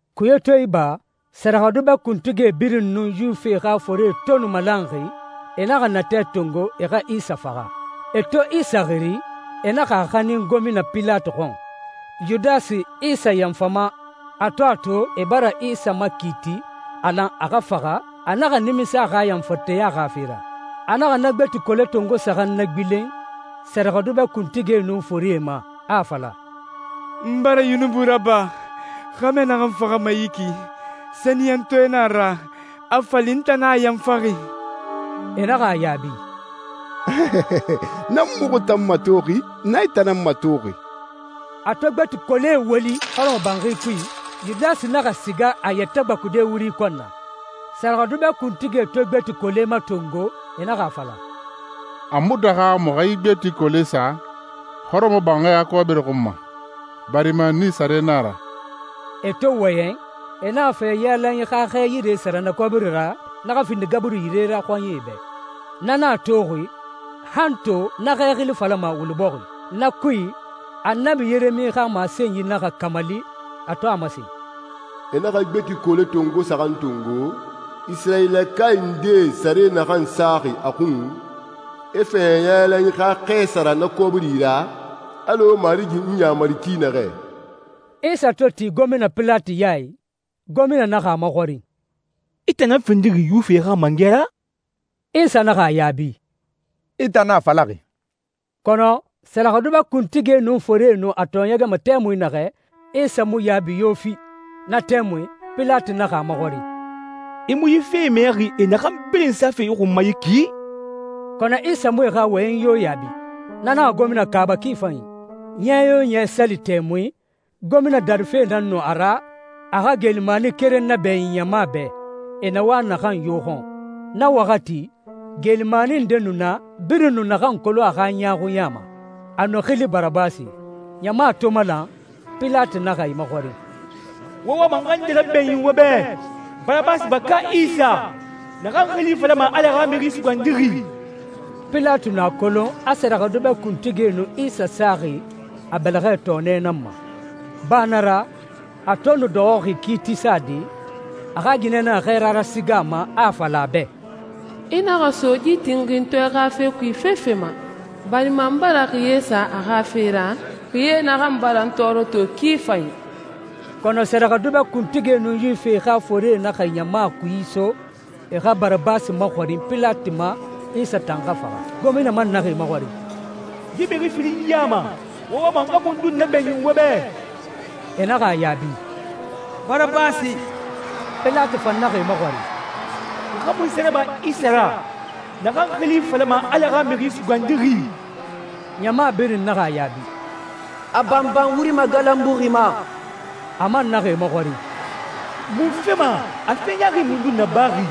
Kuye to iba, sɛrɛxɛdubɛ kuntigie birin nun Yuwifie xa forie to nu malanxi, e naxa natɛ tongo e xa Isa faxa. E to Isa xiri, e naxa a xanin gomina Pilati xɔn. Yudasi, Isa yanfama, a to a to e bara Isa makiiti a lan a xa faxa, a naxa nimisa a xa yanfanteya xa fe ra. A naxa na gbeti kole tongo saxan nagbilen sɛrɛxɛdubɛ kuntigie nun forie ma, a a fala, «N bara yunubi raba! Xɛmɛ naxan faxama yi ki, sɛniyɛntɔɛ nan a ra, a fa li n tan nan a yanfaxi!» E naxa a yaabi, «Na mu muxu tan matoxi. Na i tan nan matoxi.» A to gbeti kolee woli hɔrɔmɔbanxi kui, Yudasi naxa siga a yɛtɛ gbakude wuri kɔn na. Sɛrɛxɛdubɛ kuntigie to gbeti kolee matongo, e naxa a fala, «A mu daxa muxu xa yi gbeti kolee sa hɔrɔmɔbanxi xa kɔbiri xun ma, barima nii sare nan a ra.» E to wɔyɛn, e naxa fɛɲɛ yailanyi xa xɛ yire sara na kɔbiri ra, na xa findi gaburi yire ra xɔɲɛe bɛ. Na nan a toxi, han to na xɛ xili falama «Wuli Bɔxi.» Na kui, Annabi Yeremi xa masenyi naxa kamali, a to a masen, «E naxa gbeti kole tongo saxan tongo, Isirayilakae ndee sare naxan saxi a xun, e fɛɲɛ yailanyi xa xɛ sara na kɔbiri ra, alɔ Marigi n yamari ki naxɛ.» Isa to ti gomina Pilati ya i, gomina naxa a maxɔrin, «I tan nan findixi Yuwifie xa mangɛ ra?» Isa naxa a yaabi, «I tan nan a falaxi.» Kɔnɔ sɛrɛxɛdubɛ kuntigie nun forie nu a tɔɔɲɛgɛma tɛmui naxɛ, Isa mu yaabi yo fi. Na tɛmui Pilati naxa a maxɔrin, «I mu yi fee mɛxi e naxan birin safe i xun ma yi ki?» Kɔnɔ Isa mu e xa wɔyɛnyi yo yaabi. Na naxa gomina kaaba ki fanyi. Ɲɛ yo ɲɛ, sali tɛmui, gomina darife nan nu a ra, a xa geelimani keren nabɛɲin ɲama bɛ, e na wa naxan yo xɔn. Na waxati, geelimani nde nu na, birin nu naxan kolon a xa ɲaaxuɲa ma. A nu xili Barabasi. Ɲama to malan, Pilati naxa e maxɔrin, «Wo wama n xa nde rabɛɲin wo bɛ, Barabasi ba, ka Isa, naxan xili falama Ala xa Mixi Sugandixi?» Pilati nu a kolon a sɛrɛxɛdubɛ kuntigie nu Isa saxi a bɛlɛxɛ tɔɔnɛ nan ma. Ba na ra, a to nu dɔxɔxi kiiti sade, a xa ginɛ naxa xɛɛra rasiga a ma, a a fala a bɛ, «I naxa so yi tinxintɔɛ xa fe kui fefe ma, barima n bara xiye sa a xa fe ra, xiye naxan bara n tɔɔrɔ to ki fanyi.» Kɔnɔ sɛrɛxɛdubɛ kuntigie nun Yuwifie xa forie naxa ɲama kui iso e xa Barabasi maxɔrin Pilati ma, Isa tan xa faxa. Gomina man naxa e maxɔrin, «Yi mixi firin ya ma, wo wama n xa mundun nabɛɲin wo bɛ?» E naxa a yaabi, «Barabasi!» Pilati fan naxa e maxɔrin, «N xa munse raba Isa ra, naxan xili falama Ala xa Mixi Sugandixi?» Ɲama birin naxa a yaabi, «A banban wuri magalanbuxi ma!» A man naxa e maxɔrin, «Munfe ma? A fe ɲaaxi mundun nabaxi?»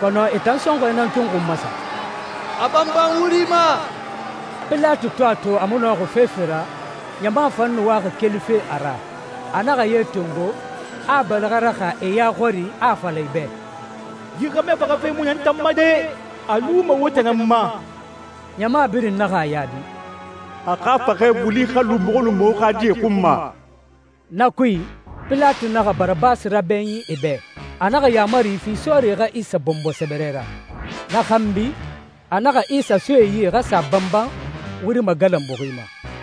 Kɔnɔ e tan sɔnxɔɛ nan tun xun masa, «A banban wuri ma!» Pilati to a to a a mu nɔxi fefe ra, ɲama fan nu waxi kelife a ra, a naxa ye tongo, a a bɛlɛxɛ raxa e ya xɔri, a a fala e bɛ, «Yi xɛmɛ faxafe mu na n tan ma de! A luma wo tan nan ma.» Ɲama birin naxa a yaabi, «A xa faxɛ wuli xa lu muxu nun muxu xa die xun ma!» Na kui, Pilati naxa Barabasi rabɛɲin e bɛ. A naxa yaamari fi sɔɔrie xa Isa bɔnbɔ sɛbɛrɛ ra. Na xanbi, a naxa Isa so e yi e xa sa a banban wuri magalanbuxi ma.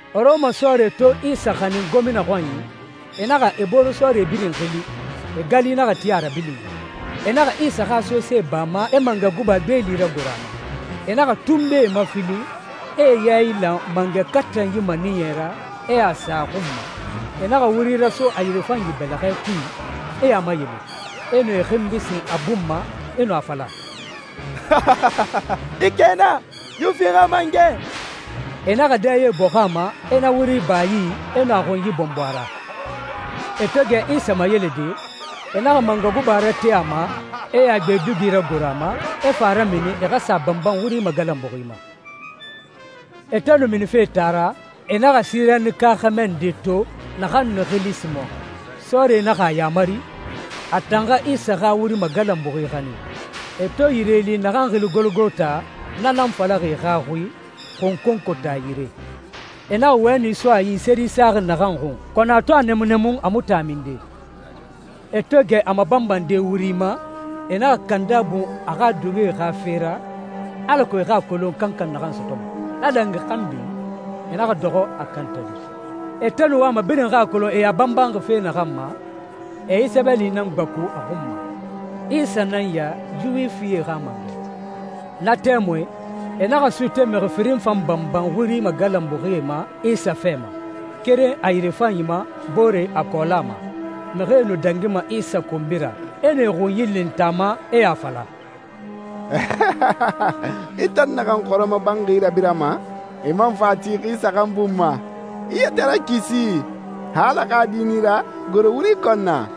Rɔma sɔɔrie to Isa xanin gomina xɔnyi, e naxa e boore sɔɔrie birin xili, e gali naxa ti a rabilinyi. E naxa Isa xa sose ba a ma, e mangɛ guba gbeeli ragoro a ma. E naxa tunbee mafilin, e e yailan mangɛ katanyi maniyɛ ra, e a sa a xun ma. E naxa wuri raso a yirefanyi bɛlɛxɛ kui, e a mayele, e nu e xinbi sin a bun ma, e nu a fala, «I kɛna, Yuwifie xa mangɛ.» E naxa dɛye bɔxun a ma, e na wuri ba a yi, e nu a xunyi bɔnbɔ a ra. E to gɛ Isa mayelede, e naxa mangɛ guba rate a ma, e a gbe dugi ragoro a ma, e fa a ramini e xa sa a banban wuri magalanbuxi ma. E to nu minife taa ra, e naxa Sirenika xɛmɛ nde to naxan nu xili Simɔn. Sɔɔrie naxa a yamari, a tan xa Isa xa wuri magalanbuxi xanin. E to yire li naxan xili Gologota, na nan falaxi e xa xui, «xunkonkota yire,» e naxa wɛni so a yi, seri saxi naxan xun, kɔnɔ a to a nɛmunnɛmun, a mu tin a minde. E to gɛ a mabanbande wuri ma, e naxa kanda bun a xa dugie xa fe ra, alako e xa a kolon kankan naxan sɔtɔma. Na dangi xanbi, e naxa dɔxɔ a kantade. E to nu wama birin xa a kolon e a banbanxi fe naxan ma, e yi sɛbɛli nan gbaku a xun ma, «Isa nan ya, Yuwifie xa mangɛ.» Na tɛmui, e naxa suute mixi firin fan banban wuri magalanbuxie ma Isa fɛ ma, keren a yirefanyi ma, boore a kɔɔla ma. Mixie nu dangima Isa konbi ra, e nu e xunyi lintan a ma, e a fala, «I tan naxan hɔrɔmɔbanxi rabirama, i man fa a ti xi saxan bun ma, i yɛtɛ rakisi! Xa Ala xa Di nan i ra, goro wuri kɔn na!»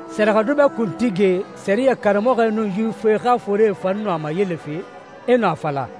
Sɛrɛxɛdubɛ kuntigie, sɛriyɛ karamɔxɔe, nun Yuwifie xa forie fan nu a mayelefe, e nu a fala,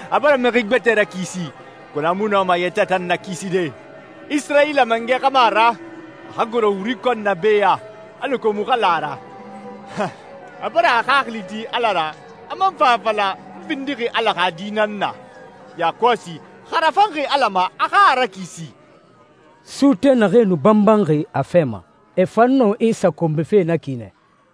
«A bara mixi gbɛtɛe rakisi, kɔnɔ a mu nɔma a yɛtɛ tan nakiside. Isirayila mangɛ xa mu a ra? A xa goro wuri kɔn na be ya, alako muxu xa la a ra. A bara a xaxili ti Ala ra, a man fa a fala, ‹N findixi Ala xa Di nan na.› Yakɔsi, xa a rafanxi Ala ma, a xa a rakisi!» Suute naxee nu banbanxi a fɛ ma, e fan nu Isa konbife na ki nɛ.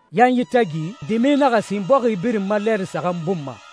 Yanyi tagi, dimi naxa sin bɔxi birin ma lɛɛri saxan bun ma.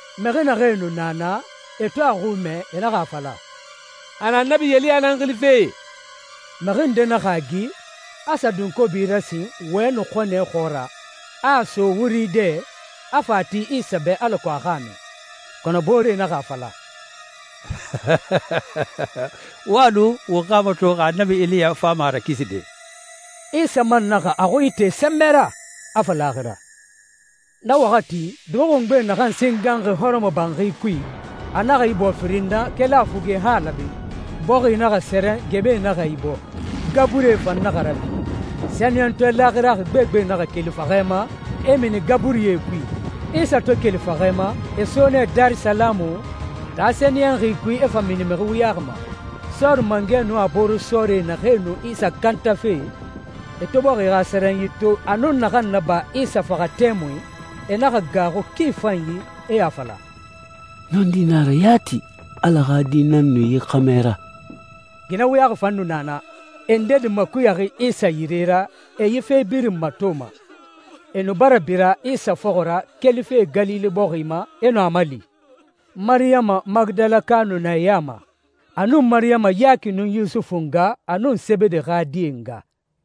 Mixi naxee nu na naa, e to a xui mɛ, e naxa a fala, «A na Annabi Eliya nan xilife!» Mixi nde naxa a gi, a sa dunkobi rasin wɛni xɔnɛ xɔɔra, a a so wuri dɛ i, a fa a ti Isa bɛ alako a xa a min. Kɔnɔ booree naxa a fala, «Wo a lu, won xa a mato xa Annabi Eliya fama a rakiside.» Isa man naxa a xui ite sɛnbɛ ra, a fa laaxira. Na waxati, dugi xungbe naxan singanxi hɔrɔmɔbanxi kui, a naxa ibɔɔ firin na, keli a fuge han a laabe. Bɔxi naxa sɛrɛn, gɛmɛe naxa ibɔɔ, gaburie fan naxa rabi. Sɛniyɛntɔɛ laaxiraxi gbegbe naxa keli faxɛ ma, e mini gaburie kui. Isa to keli faxɛ ma, e so nɛ Darisalamu, taa sɛniyɛnxi kui, e fa mini mixi wuyaxi ma. Sɔɔri mangɛ nun a boore sɔɔrie naxee nu Isa kantafe, e to bɔxi xa sɛrɛnyi to, a nun naxan naba Isa faxa tɛmui, e naxa gaaxu ki fanyi, e a fala, «Nɔndi nan a ra yati, Ala xa Di nan nu yi xɛmɛ ra!» Ginɛ wuyaxi fan nu na naa, e ndedi makuyaxi Isa yire ra, e yi fe birin matoma. E nu bara bira Isa fɔxɔ ra kelife Galile bɔxi ma, e nu a mali. Mariyama Magidalaka nu na e ya ma, a nun Mariyama Yaki nun Yusufu nga, a nun Sebede xa die nga.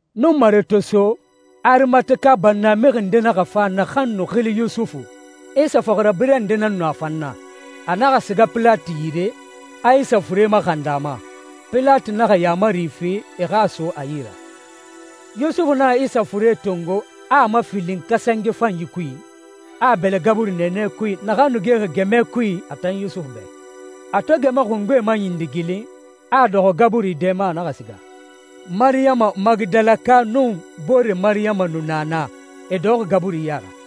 Nunmare to so, Arimateka bannamixi nde naxa fa naxan nu xili Yusufu. Isa fɔxirabirɛ nde nan nu a fan na. A naxa siga Pilati yire, a Isa fure maxandi a ma. Pilati naxa yaamari fi e xa a so a yi ra. Yusufu naxa Isa fure tongo, a a mafilin kasange fanyi kui, a a bɛlɛ gaburi nɛɛnɛ kui, naxan nu gexi gɛmɛ kui a tan Yusufu bɛ. A to gɛmɛ xungbe maɲindigilin, a a dɔxɔ gaburi dɛ ma, a naxa siga. Mariyama Magidalaka nun boore Mariyama nu na naa, e dɔxɔxi gaburi ya ra.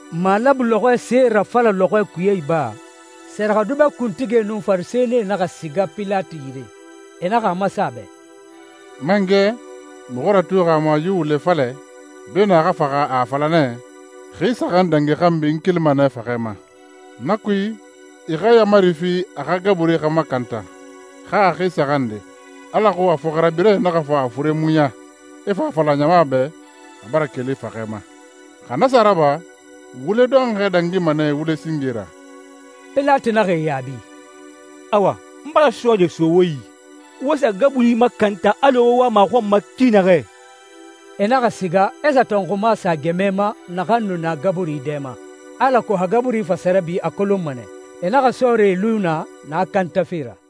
Malabu lɔxɔɛ see rafala lɔxɔɛ kuye iba, sɛrɛxɛdubɛ kuntigie nun Farisɛnie naxa siga Pilati yire. E naxa a masen a bɛ, «Mangɛ, muxu ratuxi a ma yi wule falɛ, beenun a xa faxa, a a fala nɛ, ‹Xi saxan dangi xanbi, n kelima nɛ faxɛ ma.› Na kui, i xa yaamari fi a xa gaburi xa makanta han a xi saxan nde, alako a fɔxirabirɛe naxa fa a fure muɲa, e fa a fala ɲama bɛ, ‹A bara keli faxɛ ma.› Xa na sa raba, wule dɔnxɔɛ dangima nɛ wule singe ra.» Pilati naxa e yaabi, «Awa, n bara sɔɔrie so wo yi. Wo sa gaburi makanta alɔ wo wama a xɔn ma ki naxɛ.» E naxa siga, e sa tɔnxuma sa gɛmɛ ma naxan nu na gaburi dɛ ma, alako xa gaburi fa sa rabi, a kolonma nɛ. E naxa sɔɔrie lu naa, na kantafe ra.